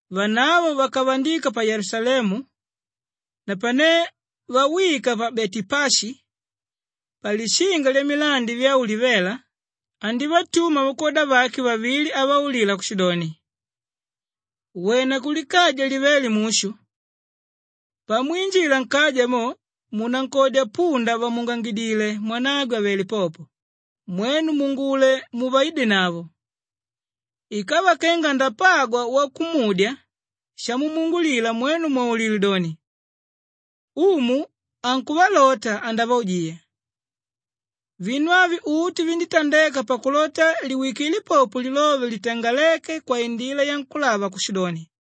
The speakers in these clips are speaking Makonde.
Vanavo vakavandika pa Yelusalemu. Napane vawika pa Betepashi, palishinga lyamilandi vya Ulivela, andívatuma vakwoda vake vavili avaulila kushidoni, “Wena kulikaja livéle mushu. Pamwinjila nkaja mo, munankodya punda vàmuungangidile mwanagwe àvele popo, mwenu muungule muvaidenavo. Ikava kenga andapagwa wakumudya shamumuungulila mwenu mwaulile doni, ‘Umu ankuvalota, andavaujiya.’” Vinu avi uti vinditandeka pakulota liwikile popo lilove litangaléke kwaindila yankúlava kushidoni,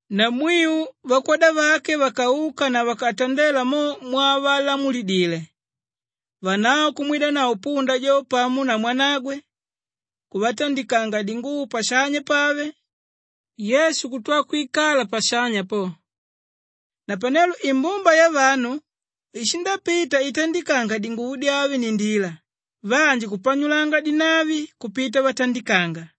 Namwiu vakwoda vake vakauka na vakatandela mo mwavalamulidile. Vanavo kumwidanavo punda jo pamo na mwanagwe, kuvatandikanga dinguvo pashanya pave, Yesu kutwa kwikala pashanya po. Napanelo imbumba yavanu ishindapita itandikanga dinguvo dyave nndila, vanji kupanyulanga dinavi kupita vatandikanga.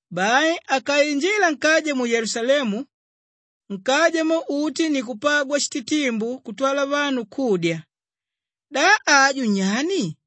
Bai akainjila nkaja mu Yelusalemu, nkaja mo uti ni kupagwa shititimbu kutwala vanu kudya, “Da aju nyani?”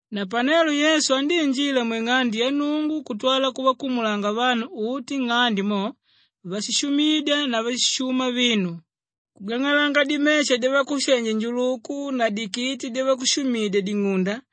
Napanelo Yesu andíinjila mwing'ande ya Nnungu kutwala kuvakumulanga vanu uti nng'ande mo váshishumidya na váshishuma vinu, kugang'alanga dimesha dyavakushenji-njuluku na dikiti dyavakushumidya-ding'unda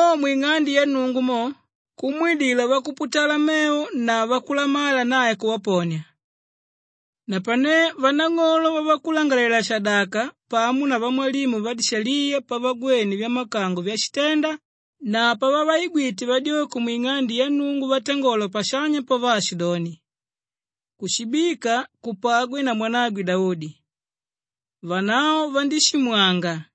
Mo mwing'ande ya Nnungu mo, kumwidila vakuputala mevo na vakulamala nae kuvaponia. Napane vanang'olo vavakulangalalela-shadaka pamo na vamwalimu vadishaliya pavagwene vyamakango vyashitenda na pavavaigwite vadyoko mwing'ande ya Nnungu vatangola pashanya po vaashidoni, “Kushibika kupagwe na mwanagwe Daudi,” vanavo vandíshimwanga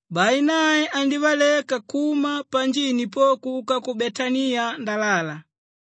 Bai nae andívaleka kuma panjini po kuka ku Betaniya ndalala.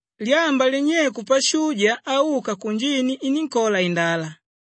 Lyamba linyeiku pashuja auka kunjini inínkola indala.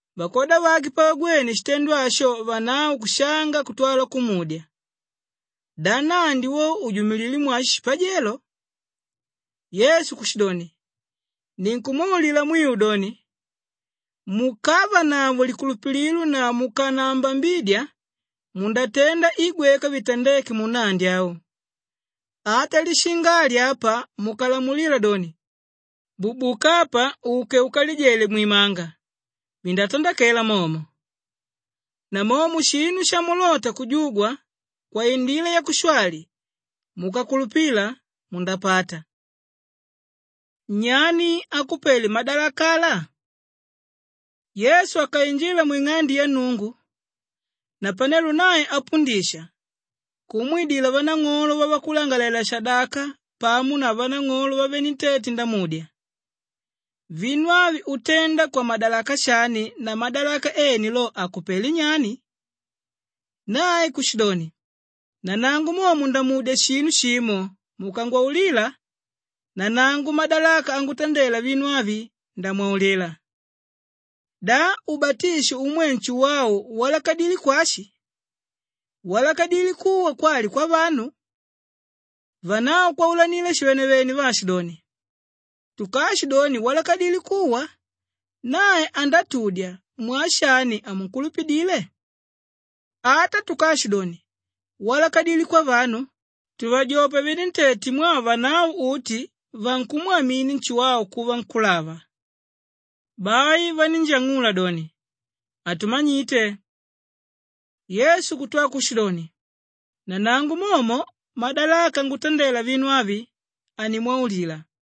Vakwoda vake pavagwene shitendo asho vanavo kushanga kutwa kumudya, “Da nnandi wo ujumililé mwashi shipajelo?” Yesu kushidoni, “Ninkumwaulila mwiu doni, mukavanavo likulupililo na mukanaambambidya, mundatenda i gweka vitandéke munnandi au. Ata lishinga ali apa mukalamulila doni, ‘Bubuka apa uke ukalijele mwimanga,’ vindatandakela momo. Namomo shinu shamulota kujugwa kwaindila yakushwali, mukakulupila mundapata.” Nyani akupele madalaka ala? Yesu akainjila mwing'ande ya Nnungu. Napanelo nae apundisha, kumwidila vanang'olo vavakulangalalela-shadaka pamo na vanang'olo vavenentete ndamudya, “Vinu avi utenda kwamadalaka shani na madalaka ene lo akupelé nyani?” Nae kushidoni, “Nanangu momo ndamudya shinu shimo mukangwaulila, nanangu madalaka angutandela vinu avi, ndamwaulila. Da ubatisho umwe Nshuwau walakadilé kwashi? Walakadilé kuwa kwali kwavanu?” Vanavo kwaulanila shivenevene vaashidoni, “Tukaashidoni, ‘Walakadilé kuwa,’ nae andatudya, ‘Mwaa shani hamunkulupidile?’ Ata tukaashidoni, ‘Walakadilé kwavanu,’ tuvajopa venentete mwaa vanavo uti vankumwamini Nshuwau kuva nkúlava.” Bai vanínjang'ula doni, “Hatumanyite.” Yesu kutwa kushidoni, “Nanangu momo madalaka angutandela vinu avi, hanimwaulila.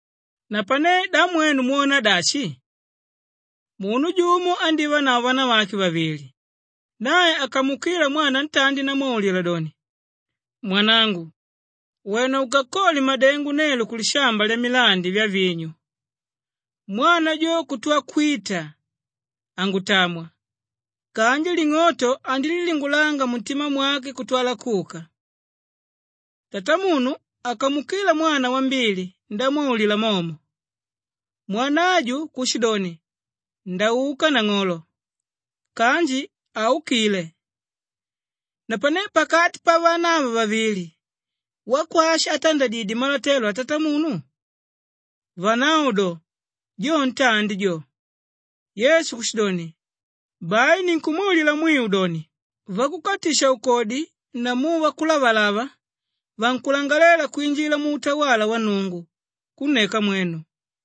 “Napane da mwenu mwona dashi? Munu jumo andívanavo vanavake vavili. Nae akamuukila mwana ntandi ndamwaulila doni, ‘Mwanangu, wena ukakole madengo nelo kulishamba lyamilandi vyavinyu.’ Mwana jo kutwa kwita, ‘Hangutamwa,’ kanji ling'oto andílilingulanga muntima mwake kutwala kuka. Tatamunu akamuukila mwana wambili ndamwaulila momo, mwana ajo kushidoni, ‘Ndauka nang'olo,’ kanji haukíle. Napanelo pakati pavana ava vavili, wakwashi átandadidye malotelo atatamunu?” Vanavo do, “Jo ntandi jo.” Yesu kushidoni, “Bai ninkumwaulila mwiu doni, vakukatisha-ukodi namu vakulavalava vankulangalela kwinjila muutawala wa Nnungu kunneka mwenu.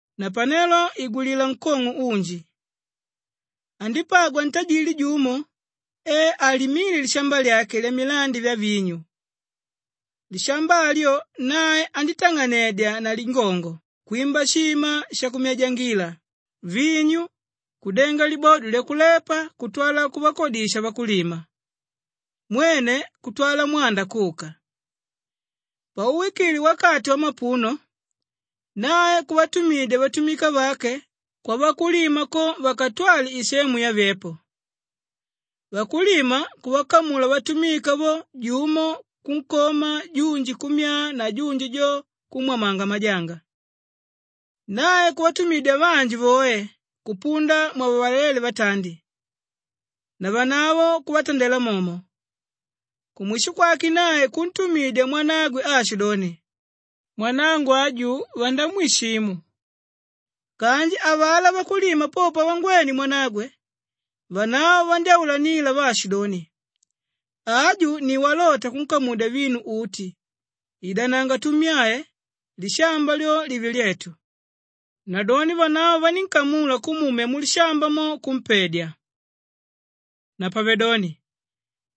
“Napanelo igwilila nkong'o unji! Andípagwa ntajili jumo e alimíle lishamba lyake lyamilandi vyavinyu. Lishamba alyo nae andítang'anedya na lingongo kwimba shima shakuminyangila vinyu, kudenga libodo lyakulepa kutwala kuvakodisha vakulima mwene kutwala mwanda kuka. Pauwikile wakati wamapuno nae kuvatumidya vatumika vake kwavakulima ko vakatwale isemu yake yavyepo. Vakulima kuvakamula vatumika vo, jumo kunkoma, junji kummyaa na junji jo kumwamanga majanga. Nae kuvatumidya vanji voe kupunda mwavalalele vatandi, navanavo kuvatandela momo. Kumwisho kwake nae kuntumidya mwanagwe aashidoni, ‘Mwanangu aju vandamwishimu!’ Kanji avalá vakulima po pavangwene mwanagwe, vanavo vandyáulanila vaashidoni, ‘Aju ni walota kunkamudya vinu uti, idananga tummyae lishamba lyo live lyetu.’ Nadoni vanavo vanínkamula kumumya mulishamba mo, kumpedya. “Napavedoni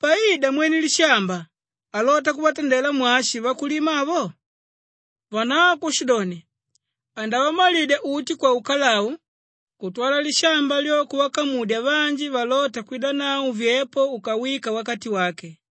paida mwene lishamba alota kuvatandela mwashi vakulima avo?” Vanavo kushidoni, “Andavamalidya uti kwaukalau kutwala lishamba lyo kuvakamudya vanji valóta kwidanavo vyepo ukawika wakati wake.”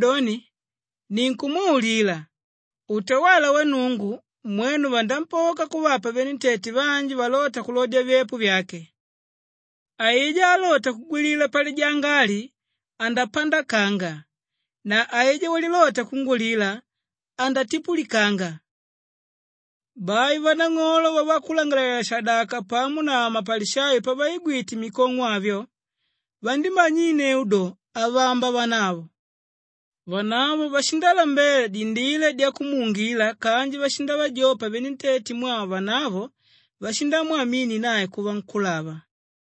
“Napavedoni ninkumwaulila, utawala wa Nnungu mwenu vanampoka kuvapa venentete vanji valóta kulodya vyepo vyake. Aijá álota kugwilila palijanga ali, andapandakanga na aijá walilota kungwilila, andatipulikanga.” Bai vanang'olo vavakulangalalela-shadaka pamo na mapalishayo pavaigwite mikong'o avyo, vandímanyinneu do, avamba vanavo. Vanavo vashindalambela dindila dyakumuungila kanji vashindavajopa venentete mwaa vanavo vashindamwamini nae kuva nkúlava.